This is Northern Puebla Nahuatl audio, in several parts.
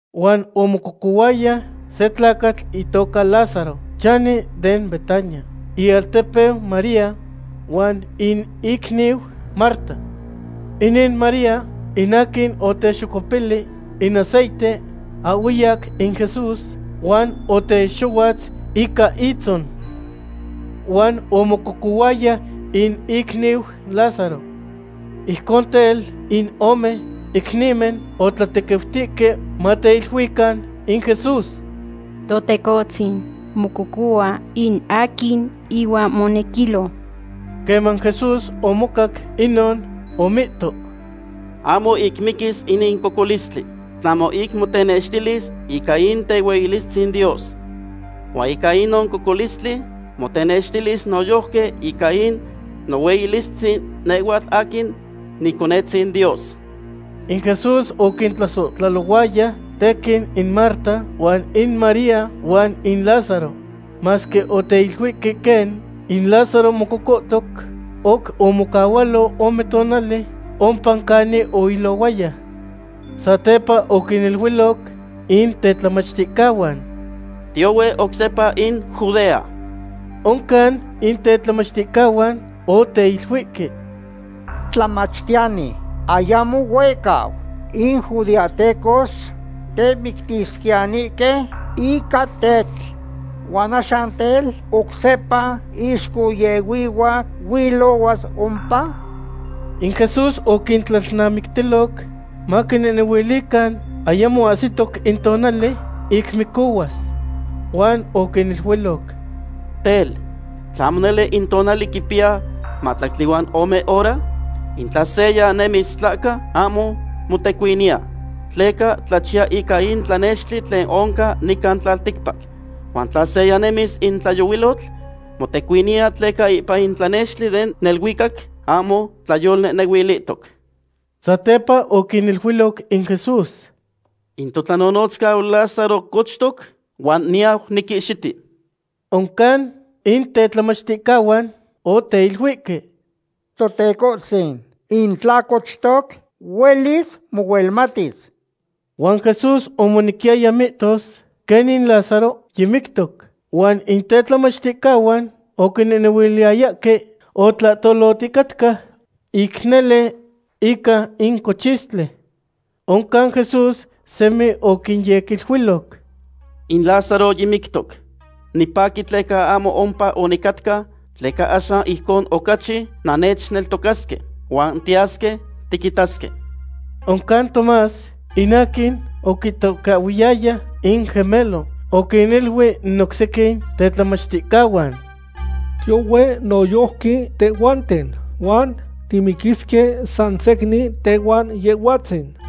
Huan omococohuaya se tlacatl itoca Lázaro, chani den Betania, in ialtepeu María huan in icniu Marta. Inin María in aquin otexocuepili in aceite ahhueyac in Jesús huan otexohuatz ica itzon. Huan omococuaya in icniu Lázaro. Ijcon tel, in ome icnimen otlatequiutihque mateiluican in Jesús: ―Totecohtzin, mococohua in aquin ihuan monequilo. Queman Jesús omocac inon, omihto: ―Ahmo ic miquis inin cocolistli. Tlahmo ic motenextilis ica in tehueyilistzin Dios. Huan ica inon cocolistli motenextilis noyojqui ica in nohueyilistzin nehhuatl aquin Niconetzin Dios. In Jesús oquintlasohtlalohuaya tequin in Marta, huan in María, huan in Lázaro. Masque oteiluihque quen in Lázaro mococohtoc, oc omocahualo ome tonali ompa canin oilohuaya. Satepa oquiniluiloc in tetlamachticahuan: ―Tiyohue oc sepa in Judea. Oncan in tetlamachticahuan oteiluihque: ―Tlamachtiyani, ayamo huehcau in judeahtecos temictisquiyanihque ica tetl. Huan axan tel, ¿oc sepa ixcohyehuihua huilohuas ompa? In Jesús oquintlalnamictiloc maquinehnehuilican ayamo ahsitoc in tonali ic micohuas. Huan oquiniluiloc: ―Tel, ¿tlahmo nele in tonali quipiya mahtlactli huan ome hora? In tla seya nemis tlahca, ahmo motecuiniya, tleca tlachiya ica in tlanextli tlen oncan nican tlalticpac. Huan tla seya nemis in tlayohuilotl, motecuiniya tleca ipan in tlanextli den neluicac ahmo tlayolnehnehuilihtoc. Satepa oquiniluiloc in Jesús: ―In totlanonotzcau Lázaro cochtoc, huan niyau niquihxiti. Oncan in tetlamachticahuan oteiluihque: ―Totecohtzin, in tla cochtoc, huelis mohuelmatis. Huan Jesús omonequiyaya mihtos quen in Lázaro yimictoc, huan in tetlamachticahuan oquinehnehuiliyayahque otlahtoloticatca ic nele ica in cochistli. Oncan Jesús semi oquinyequiluiloc: ―In Lázaro yimictoc. Nipaqui tleca ahmo ompa onicatca, tleca axan ijcon ocachi nannechneltocasque. Huan tiyasque tiquitasque. Oncan Tomás, in aquin oquitocahhuiyaya in Gemelo, oquiniluic in oc sequin tetlamachticahuan: ―Tiyohue noyojqui tehhuanten, huan timiquisque san secnin tehuan Yehhuatzin.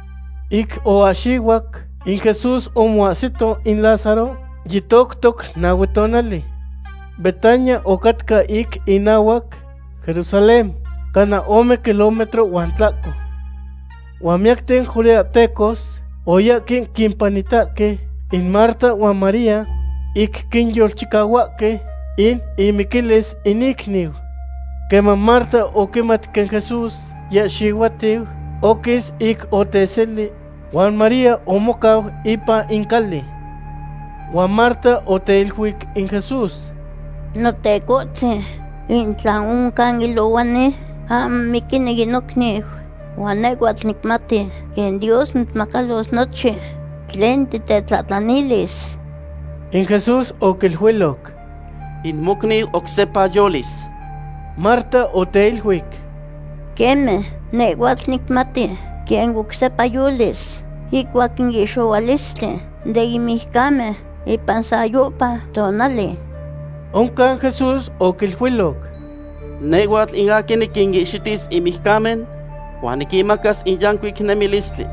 Ic oahxihuac, in Jesús omoahsito in Lázaro yitoctoc nahue tonali. Betania ocatca ic inahuac Jerusalén, cana ome kilómetro huan tlahco. Huan miyacten judeahtecos oyahque quimpanitahque in Marta huan María ic quinyolchicahuahque in imiquilis in icniu. Queman Marta oquimat quen Jesús yiahxihuatiu, oquis ic oteseli, huan María omocau ipan in cali. Huan Marta oteiluic in Jesús: ―Notecohtzin, in tla oncan ilohuani, ahmo miquini in nocniu. Huan nehhuatl nicmati quen Dios mitzmacalos nochin tlen titetlahtlanilis. In Jesús oquiluiloc: ―In mocniu oc sepa yolis. Marta oteiluic: ―Queme, nehhua nicmati quen oc sepa yolis ihcuac in ihxohualistli den mijcamen ipan sayohpa tonali. Oncan Jesús oquiluiloc: ―Nehhuatl in aquin niquinihxitis in mijcamen, huan niquinmacas in yancuic nemilistli.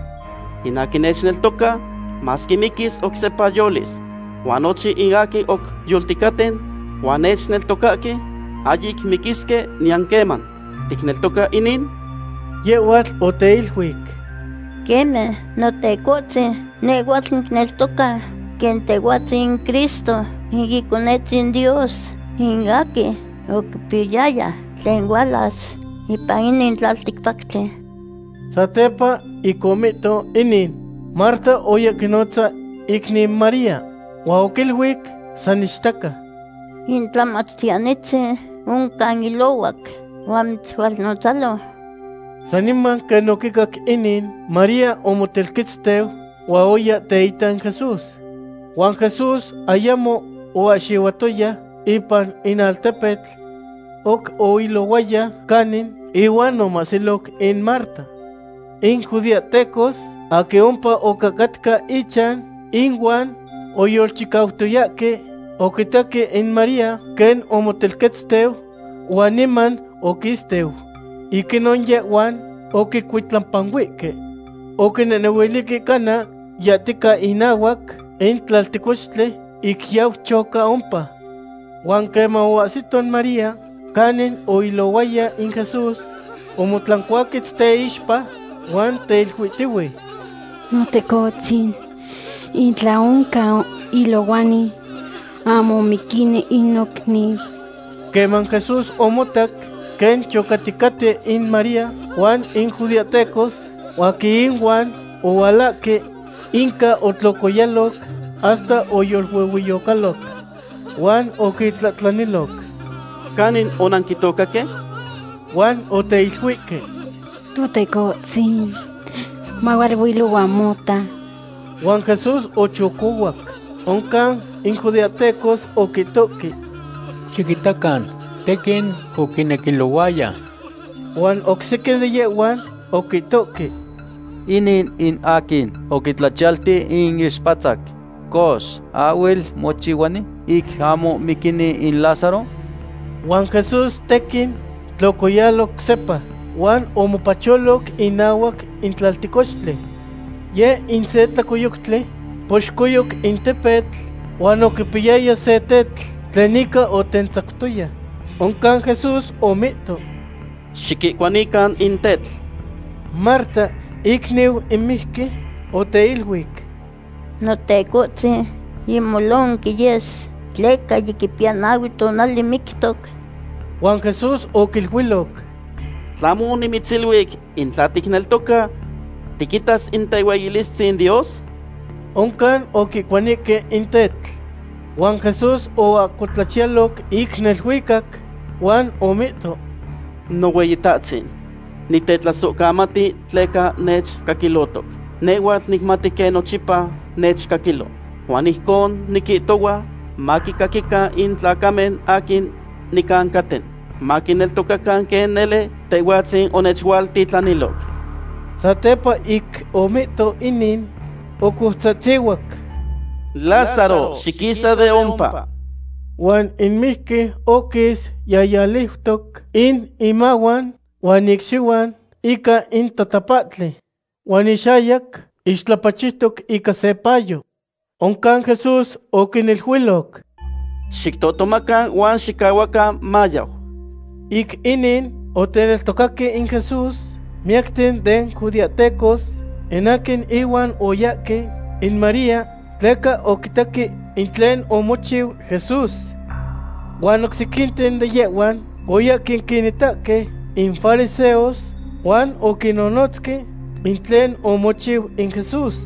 In aquin nechneltoca, masque miquis, oc sepa yolis. Huan nochin in aquin oc yolticaten, huan nechneltocahque, ahyic miquisque niyan queman. ¿Ticneltoca inin? Yehhuatl oteiluic: ―Queme, Notecohtzin, nehhuatl nicneltoca quen Tehhuatzin in Cristo, in Iconetzin Dios, in aquin oquipiyaya tlen hualas ipan inin tlalticpactli. Satepa ic omihto inin, Marta oya quinotza icniu María, huan oquiluic san ichtaca: ―In Tlamachtiyanitzin oncan ilohuac huan mitzhualnotzalo. Saniman quen oquicac inin, María omotelquetzteu huan oya teita in Jesús. Huan Jesús ayamo oahxihuatoya ipan in altepetl; oc oilohuaya canin ihuan omahsiloc in Marta. In judeahtecos aquin ompa ocahcatca ichan inuan oyolchicautoyahque oquitaque in María quen omotelquetzteu huan niman oquisteu. Ic inon yehhuan oquicuitlapanuihque. Oquinehnehuilihque cana yahtica inahuac in tlaltecochtli ic yau choca ompa. Huan queman oahsito María canin oilohuaya in Jesús, omotlancuaquetz teixpa, huan teiluihtiu: ―Notecohtzin, in tla oncan ilohuani, ahmo miquini in nocniu. Queman Jesús omotac quen chocaticaten in María huan in judeahtecos aquin ihuan ohualahque, inca otlocoyaloc hasta oyoluehueyocaloc. Huan oquintlahtlaniloc: ―¿Canin onanquitocaque? Huan oteiluihque: ―Totecohtzin, mahualuilohua mota. Huan Jesús ochocohuac. Oncan in judeahtecos oquitohque: ―Xiquitacan tequin oquinequilohuaya. Huan oc sequin de yehhuan oquitohque: ―Inin in aquin oquitlachiyalti in ixpatzac. Cox, ¿ahhuel mochihuani ic ahmo miquini in Lázaro? Huan Jesús tequin tlocoyalo oc sepa, huan omopacholoc inahuac in tlaltecochtli. Yeh in se tlacoyoctli poxcoyoc in tepetl huan oquipiyaya se tetl tlen ica otentzactoya. Oncan Jesús omihto: ―Xiquihcuanican in tetl. Marta, icniu in mijqui, oteiluic: ―Notecohtzin, yimolonqui yes, tleca yiquipiya nahue tonali mictoc. Huan Jesús oquiluiloc: ―¿Tlahmo onimitziluic in tla ticneltoca, tiquitas in tehueyilistzin Dios? Oncan oquihcuanihque in tetl. Huan Jesús oahcotlachiyaloc ic neluicac huan omihto: ―Nohueyitahtzin, nitetlasohcamati tleca nechcaquilotoc. Nehhuatl nicmati quen nochipa nechcaquilo, huan ijcon niquihtohua maquicaquican in tlacamen aquin nicancaten, maquineltocacan quen nele Tehhuatzin onechualtitlaniloc. Satepa ic omihto inin, ocoutzahtzihuac: ―¡Lázaro, xiquisa de ompa! Huan in mijqui oquis yahyaliutoc in imahuan huan icxihuan ica in tatapahtli. Huan ixayac ixtlapachiutoc ica se payo. Oncan Jesús oquiniluiloc: ―Xictohtomacan huan xicahuacan mayau. Ic inin, oteneltocaque in Jesús miyacten den judeahtecos in aquin ihuan oyahque in María tleca oquitaque in tlen omochiu Jesús. Huan oc sequinten de yehhuan oyahque quinitahque in fariseos huan oquinnonotzque in tlen omochiu in Jesús.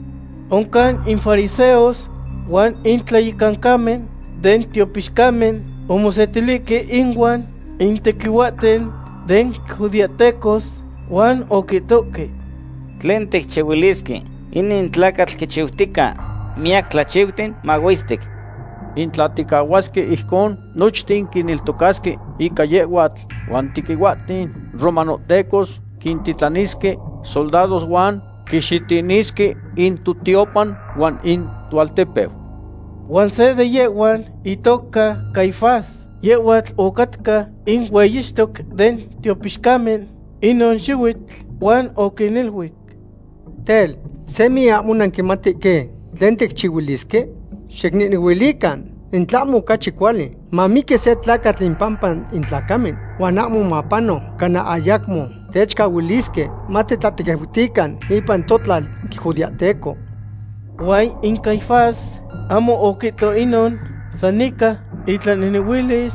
Oncan in fariseos huan in tlayecancamen den tiopixcamen omosetilihque inuan in tequihuahten den judeahtecos huan oquihtohque: ―¿Tlen ticchihuilisque? Inin tlacatl quichiutica miyac tlachiuten mahuestic. In tla ticahuasque ijcon, nochten quineltocasque ica yehhuatl, huan in tequihuahten romanohtecos quintitlanisque soldados huan quixitinisque in totiopan huan in toaltepeu. Huan se de yehhuan, itoca Caifás, yehhuatl ocatca in hueyixtoc den tiopixcamen inon xihuitl, huan oquiniluic: ―Tel, ¿semi ahmo nanquimatihque tlen ticchihuilisque? Xicnehnehuilican in tlahmo ocachi cuali mamiqui se tlacatl impampa in tlacamen, huan ahmo mapano cana ayacmo techcahuilisque matitlatequiutican ipan totlal judeahteco. Huan in Caifás ahmo oquihto inon san ica itlanehnehuilis,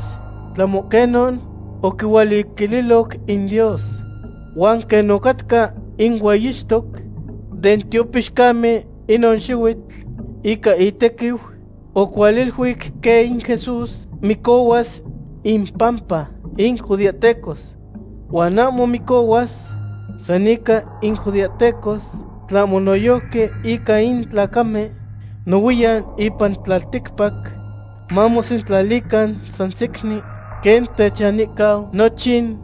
tlahmo quenon oquihualiluiloc in Dios. Huan quen ocatca in hueyixtoc den tiopixcamen inon xihuitl, ica itequiu oquihualiluic quen in Jesús micohuas impampa in judeahtecos. Huan ahmo micohuas san ica in judeahtecos, tlahmo noyojqui ica in tlacamen nohuiyan ipan tlalticpac, mamosentlalican san secnin quen techanihcau nochin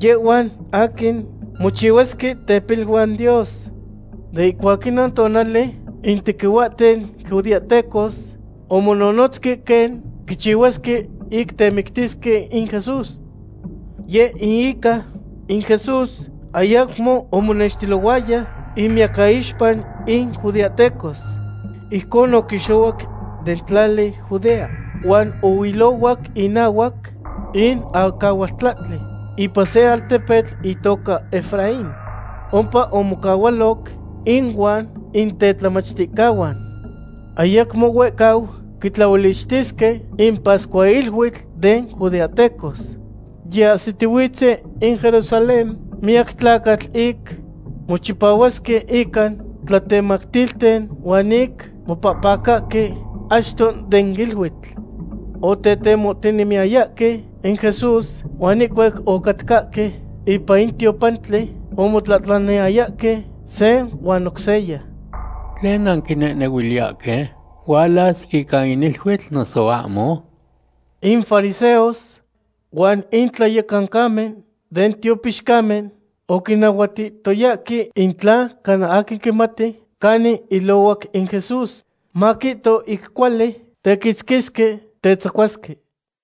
yehhuan aquin mochihuasque tepiluan Dios. De ihcuac inon tonali in tequihuahten judeahtecos omononotzque quen quichihuasque ic temictisque in Jesús. Yeh in ica in Jesús ayacmo omonextilohuaya inmiyacaixpa in judeahtecos. Ijcon oquixohuac den tlali Judea huan ohuilohuac inahuac in acahualtlahtli, ipan se altepetl itoca Efraín. Ompa omocahualoc inuan in tetlamachticahuan. Ayacmo huehcau quitlaolichtisque in pascuahiluitl den judeahtecos. Yiahsitihuitzen in Jerusalén miyac tlacatl ic mochipahuasque ica tlatemactilten huan ic mopahpacahque achto den iluitl. Otetemohtinemiyayahque in Jesús, huan ihcuac ocatcahque ipan in tiopantli, omotlahtlaniyayahque se huan oc seya: ―¿Tlen nanquinehnehuiliyahque? ¿Hualas ica in iluitl, noso ahmo? In fariseos huan in tlayecancamen den tiopixcamen oquinahuatihtoyahque in tla cana aquin quimati canin ilohuac in Jesús, maquihto ic cuali tequitzquisque tetzacuasque.